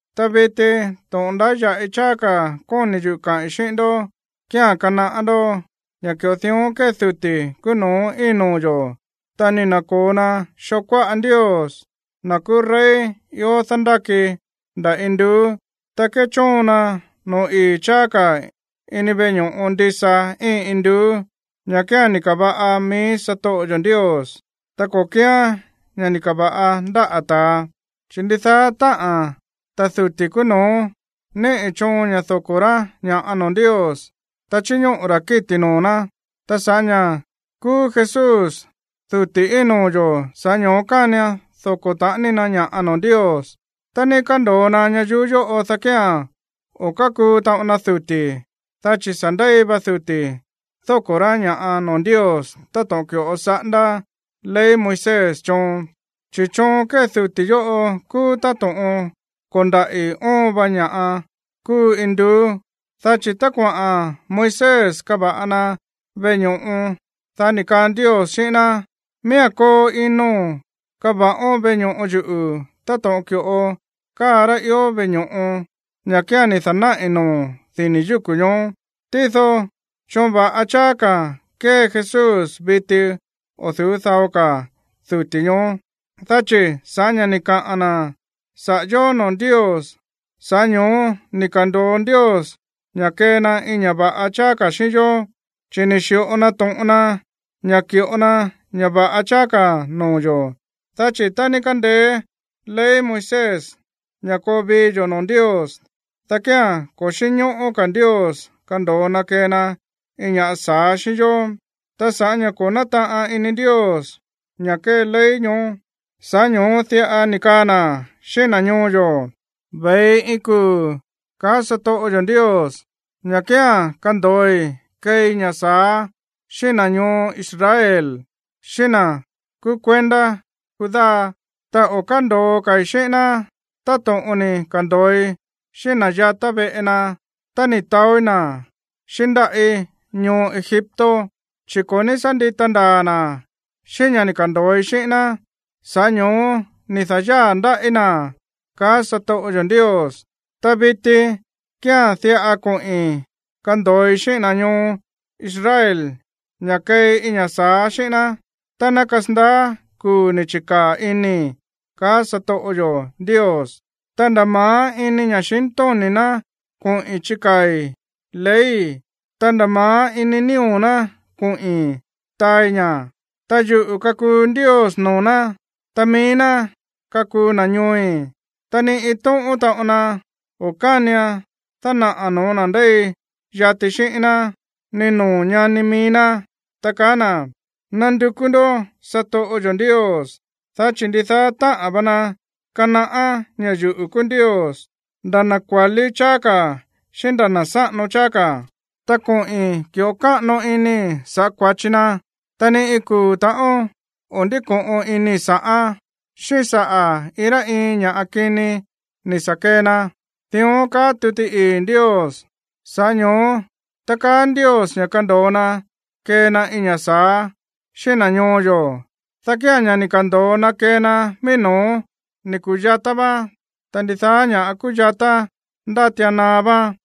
Ta viti, to̱ꞌon ndáya̱ꞌi cháá ka̱ kóni̱ yuꞌu̱ kaꞌi̱n xíꞌín ndó kía̱n kanaꞌá ndó ña̱ ki̱ꞌo dión kée duti̱ kúú no̱ó íin noo̱ yo̱, ta ni̱ na̱ko̱o na xoo kuáꞌa Ndios, na̱ kúú rey ió dándáki nda̱ induú. Ta kéchóon na no̱ó ii̱ cháá ka̱ ini veꞌe ño̱ꞌo ndisa íin induú, ña̱ kía̱n ni̱ ka̱va̱ꞌa mií satoꞌo yo̱ Ndios, ta ko̱ kíán ña̱ ni̱ ka̱va̱ꞌa ndáꞌa̱ ta̱a. Chi̱ ndidaá táꞌa̱n ta̱ duti̱ kúú no̱ó níꞌi̱ choon ña̱ doko̱ rá ña̱ꞌa noo̱ Ndios, ta chíñóꞌo̱ ra̱ kíti̱ noo̱ ná. Ta sa̱ꞌá ña̱ kúú Jesús duti̱ íin noo̱ yo̱, sa̱ꞌá ño̱ó kánian doko̱ taꞌani na ña̱ꞌa noo̱ Ndios. Tá ni̱ ka̱ndo̱o na ñayuú yóꞌo, dá kía̱n o̱ kákuu taꞌon na duti̱, dá chi̱ sa̱ ndéi va duti̱ dóko̱ rá ña̱ꞌa noo̱ Ndios táto̱ꞌon ki̱ꞌo saꞌándá ley Moisés choon. Chi̱ choon kée duti̱ yóꞌo kúú táto̱ꞌon ko̱ndaꞌi̱ óon va ña̱ kúu induú. Dá chi̱ tá kuaꞌa̱n Moisés kava̱ꞌa na veꞌe ño̱ꞌo, dá ni̱ kaa Ndios xíꞌín ná: “Miía̱n koo ino̱n kava̱ꞌón veꞌe ño̱ꞌo yuꞌu̱ táto̱ꞌon ki̱ꞌo káa rá ió veꞌe ño̱ꞌo, ña̱ kía̱n ni̱ da̱náꞌi̱ noo̱o̱n dini̱ yúku̱ ñoó.” Tído choon va̱ꞌa cháá ka̱ kée Jesús viti o̱ du̱ú dao ka̱ duti̱ ñoó, dá chi̱ sa̱ꞌá ña̱ ni̱ kaꞌa̱n na̱ saꞌa̱ yó noo̱ Ndios, sa̱ꞌá ño̱ó ni̱ ka̱ndo̱o Ndios ña̱ kee na iin ña̱ꞌa va̱ꞌa cháá ka̱ xíꞌín yó, chi̱ ni̱ xi̱ꞌo na to̱ꞌon na ña̱ ki̱ꞌo na ña̱ va̱ꞌa cháá ka̱ noo̱ yo̱. Dá chi̱ tá ní kándeé ley Moisés ña̱ koo vii yo̱ noo̱ Ndios, dá kía̱n ko̱ xínñóꞌó ka̱ Ndios kando̱o na kee na iin ña̱ꞌa sa̱á xíꞌín yó. Ta sa̱ꞌá ña̱ ko̱ nátaꞌan ini Ndios ña̱ kée ley ñoó, sa̱ꞌá ño̱ó diꞌa ni̱ kaa na̱ xíꞌín na̱ ñoo yo̱: Ve̱i iin kuu̱, kaá satoꞌo yo̱ Ndios, ña̱ kía̱n kando̱oi keei ña̱ sa̱á xíꞌín na̱ ñoo Israel, xíꞌín na̱ kúú kuendá Judá. Ta o̱ kándo̱o ka̱i̱ xíꞌín ná táto̱ꞌon ni̱ ka̱ndo̱oi xíꞌín na̱ yatá veꞌe na tá ni̱ taóí na̱ xíꞌín ndáꞌí ñoo Egipto. Chi̱ ko̱ ní sá ndita ndaa̱ na̱ xíꞌín ña̱ ni̱ ka̱ndo̱oi xíꞌín ná, sa̱ꞌá ño̱ó ni̱ da̱yáa̱ ndáꞌí na̱, kaá satoꞌo yo̱ Ndios. Ta viti kía̱n diꞌa koꞌi̱n kando̱oi xíꞌín na̱ ñoo Israel ña̱ keei iin ña̱ sa̱á xíꞌín ná tá ná kasandaá kuu̱ ni̱ chi̱kaa̱ inii̱, kaá satoꞌo yo̱ Ndios: Ta nda̱ ma̱á ini ña̱xintóni̱ ná koꞌi̱n chikaa̱i̱ leyi̱, ta nda̱ ma̱á ini nío̱ ná koꞌi̱n taai ña̱, Ta yuꞌu̱ kakuu Ndios noo̱ ná, ta mií ná kakuu na̱ ñooi̱. Ta ni iin tóꞌón taꞌon na o̱ kánian dánaꞌa̱ no̱ó na̱ ndéi yati xíꞌín ná, ni noo̱ ñani mií ná, ta kaa na̱: “Nandukú ndó satoꞌo yo̱ Ndios”, dá chi̱ ndidaá táꞌa̱n va na kanaꞌá ña̱ yuꞌu̱ kúú Ndios, nda̱ na̱ kua̱lí cháá ka̱ xíꞌín nda̱ na̱ sáꞌano cháá ka̱. Ta koꞌi̱n ki̱ꞌo káꞌano inii̱ sa̱ꞌá kua̱chi na, ta ni iin kuu̱ ta̱ꞌón o̱ ndíko̱ꞌon inii̱ sa̱ꞌán, xíꞌín saꞌa̱ iin rá iin ña̱ kini ni̱ sa̱ kee na. Dión kaá tuti ii̱ Ndios. Sa̱ꞌá ño̱ó tá kaá Ndios ña̱ kando̱o na kee na iin ña̱ sa̱á xíꞌín na̱ ñoo yo̱, dá kía̱n ña̱ ni̱ ka̱ndo̱o na kee na mií no̱ó ni̱ ku̱yatá váán, ta ndidaá ña̱ꞌa kúyatá, ndátian naá váán.